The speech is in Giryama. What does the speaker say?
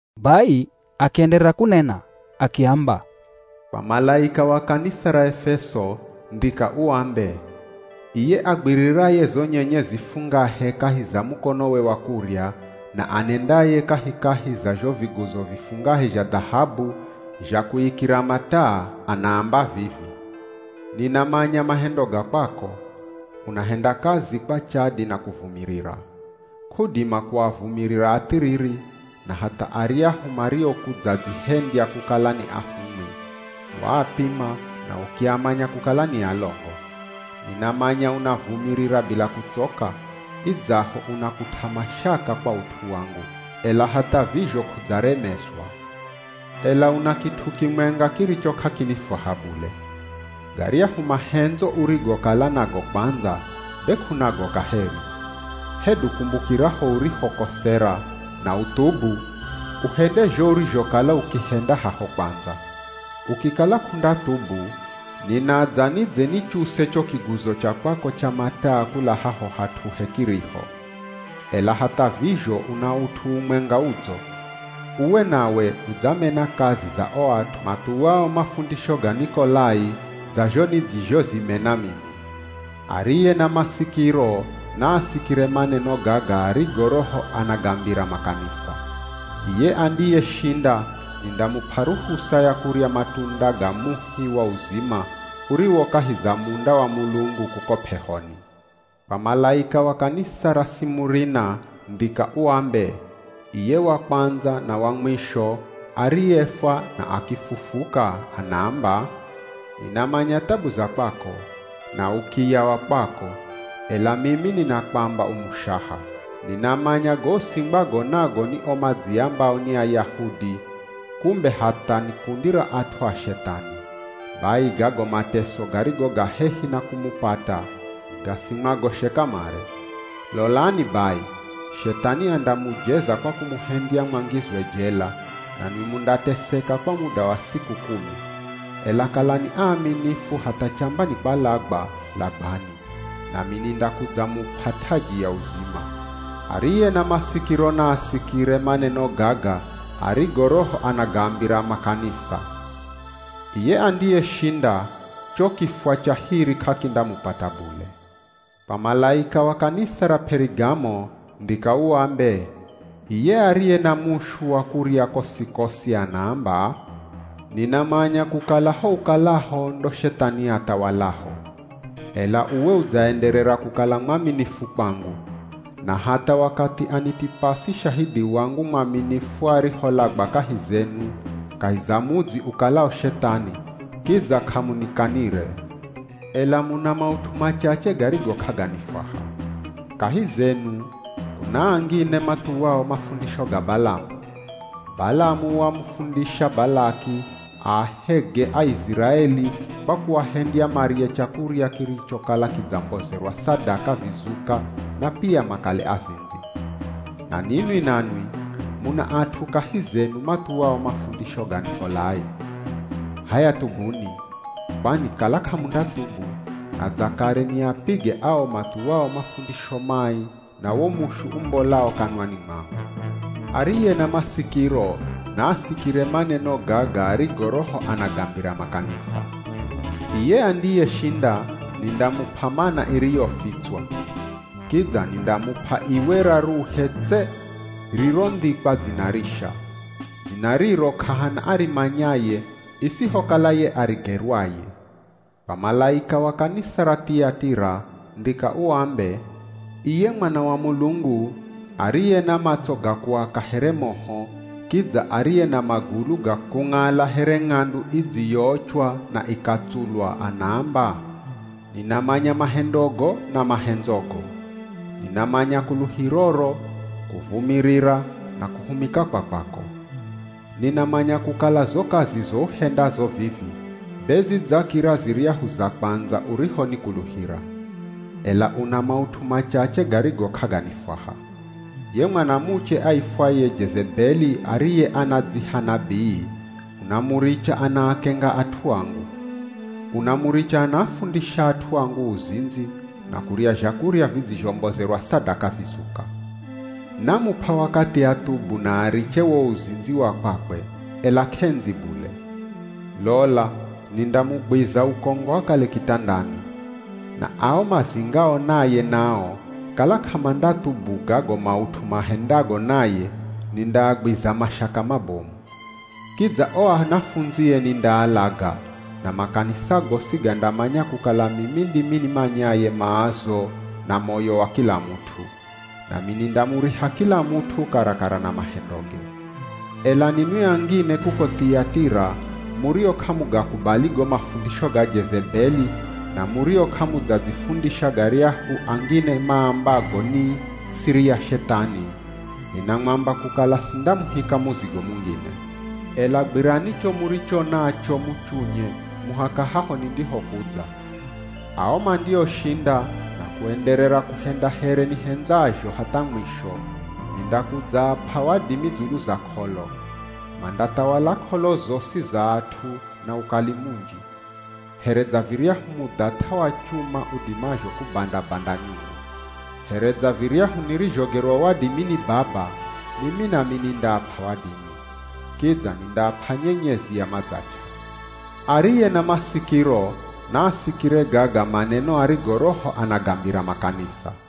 Bai akienderera kunena akiamba, “Kwa malaika wa kanisa ra Efeso, ndhika uambe, ‘Iye agwiriraye zo nyenyezi fungahe kahi za mukonowe wa kurya, na anendaye kahikahi za zho viguzo vifungahe zha dhahabu, zha kuikira mataa, anaamba vivi: Ninamanya mahendo ga kwako. Unahenda kazi kwa chadi na kuvumirira. K'udima kuavumirira athiriri, na hatha aryahu mariokudzadzihendya kukala ni ahumwi, waapima na ukiamanya kukala ni alongo. Ninamanya unavumirira bila kutsoka, idzaho unakut'a mashaka kwa ut'u wangu, ela hatha vizho k'udzaremezwa. Ela una kit'u kimwenga kiricho k'akinifwaha bule. Garyahu mahendzo urigokala nago kwandza, be k'unago kaheri. Hedu kumbukira ho urihokosera, na uthubu, uhende zho urizhokala ukihenda haho kwandza. Ukikala k'undathubu, ninadza nidze nichuse cho kiguzo cha kwako cha mataa kula haho hat'uhe kiriho. Ela hatha vizho una ut'u umwenga udzo. Uwe nawe udzamena kazi za o at'u mathuwao mafundisho ga Nikolai dza zho nidzizhozimena mimi. Ariye na masikiro naasikire maneno gaga arigo Roho anagambira makanisa. Iye andiyeshinda nindamup'a ruhusa ya kurya matunda ga muhi wa uzima uriwo kahi za munda wa Mulungu kuko p'ehoni.’” “Kwa malaika wa kanisa ra Simurina, ndhika uambe, ‘Iye wa Kwandza na wa Mwisho, ariyefwa na akifufuka, anaamba: Ninamanya thabu za kwako, na ukiya wa kwako (ela mimi ninakwamba u mushaha). Ninamanya go usingwago nago ni o madziambao ni Ayahudi, kumbe hatha ni kundi ra at'u a Shethani. Bai gago mateso garigo ga hehi na kumupata, gasimwagoshe kamare. Lolani bai, Shethani andamujeza kwa kumuhendya mwangizwe jela, nanwi mundateseka kwa muda wa siku kumi. Ela kalani aaminifu hatha chamba ni kwalagwa, lagwani, nami nindakudzamup'a taji ya uzima. Ariye na masikiro naasikire maneno gaga arigo Roho anagambira makanisa. Iye andiyeshinda, cho kifwa cha hiri k'akindamupata bule.’” “Kwa malaika wa kanisa ra P'erigamo, ndhika uambe, ‘Iye ariye na mushu wa kurya kosi-kosi anaamba: Ninamanya kukala ho ukalaho ndo Shethani athawalaho. Ela uwe udzaenderera kukala mwaminifu kwangu. Na hatha wakathi Anitipasi shahidhi wangu mwaminifu ariholagwa kahi zenu, kahi za mudzi ukalao Shethani, kidza k'amunikanire. Ela muna maut'u machache garigo k'aganifwaha. Kahi zenu, kuna angine mathuwao mafundisho ga Balamu. Balamu wamufundisha Balaki aahege Aiziraeli kwa kuahendya marye chakurya kirichokala kidzambozerwa sadaka vizuka na pia makale azindzi. Na ninwi nanwi, muna at'u kahi zenu mathuwao mafundisho ga Nikolai. H'aya thubuni, kwani kala k'amundathubu, nadza kare niapige ao mathuwao mafundisho mai na wo mushu umbolao kanwani mwangu. Ariye na masikiro naasikire maneno gaga arigo Roho anagambira makanisa. Iye andiyeshinda nindamup'a Mana iriyofitswa. Kidza nindamup'a iwe raruhe tse rirondhikwa dzina risha. Dzina riro k'ahana arimanyaye isihokala ye arigerwaye.’” “Kwa malaika wa kanisa ra Thiyatira, ndhika uambe, ‘Iye Mwana wa Mulungu, ariye na matso ga kuaka here moho, kidza ariye na magulu ga kung'ala here ng'andu idziyoochwa na ikatsulwa, anaamba: Ninamanya mahendogo, na mahendzogo. Ninamanya kuluhiroro, kuvumirira na kuhumika kwa kwako. Ninamanya kukala zo kazizo uhendazo vivi be zidzakira ziryahu za kwandza urihonikuluhira. Ela una maut'u machache garigo k'aganifwaha. Ye mwanamuche aifwaye Jezebeli ariye anadziha nabii, unamuricha anaakenga at'u angu. Unamuricha anaafundisha at'u angu uzindzi, na kurya zhakurya vidzizhombozerwa sadaka vizuka. Namup'a wakathi athubu na ariche wo uzindzi wa kwakwe, ela k'endzi bule. Lola nindamugwiza ukongo akale kitandani. Na ao mazingao naye nao kala k'amandathubu gago maut'u mahendago naye, nindaagwiza mashaka mabomu. Kidza o anafundzie nindaalaga na makanisa gosi gandamanya kukala mimi ndimi nimanyaye maazo na moyo wa kila mut'u. Nami nindamuriha kila mut'u karakara na mahendoge. Ela ninwi angine kuko Thiyatira, murio k'amugakubali go mafundisho ga Jezebeli, na murio k'amudzadzifundisha garyahu angine maambago ni “siri ya Shethani,” ninamwamba kukala sindamuhika muzigo mungine. Ela gwirani cho muricho nacho muchunye muhaka haho nindihokudza. Ao mandioshinda, na kuenderera kuhenda here nihendzazho hatha mwisho, nindakudzaap'a wadimi dzulu za k'olo. Mandathawala k'olo zosi za at'u na ukali munji, here dza viryahu mudhath'a wa chuma udimazho kubanda-banda nyungu. Here dza viryahu nirizhogerwa wadimi ni Baba mimi nami nindaap'a wadimi. Kidza nindaap'a nyenyezi ya madzach'a. Ariye na masikiro naasikire gaga maneno arigo Roho anagambira makanisa.’”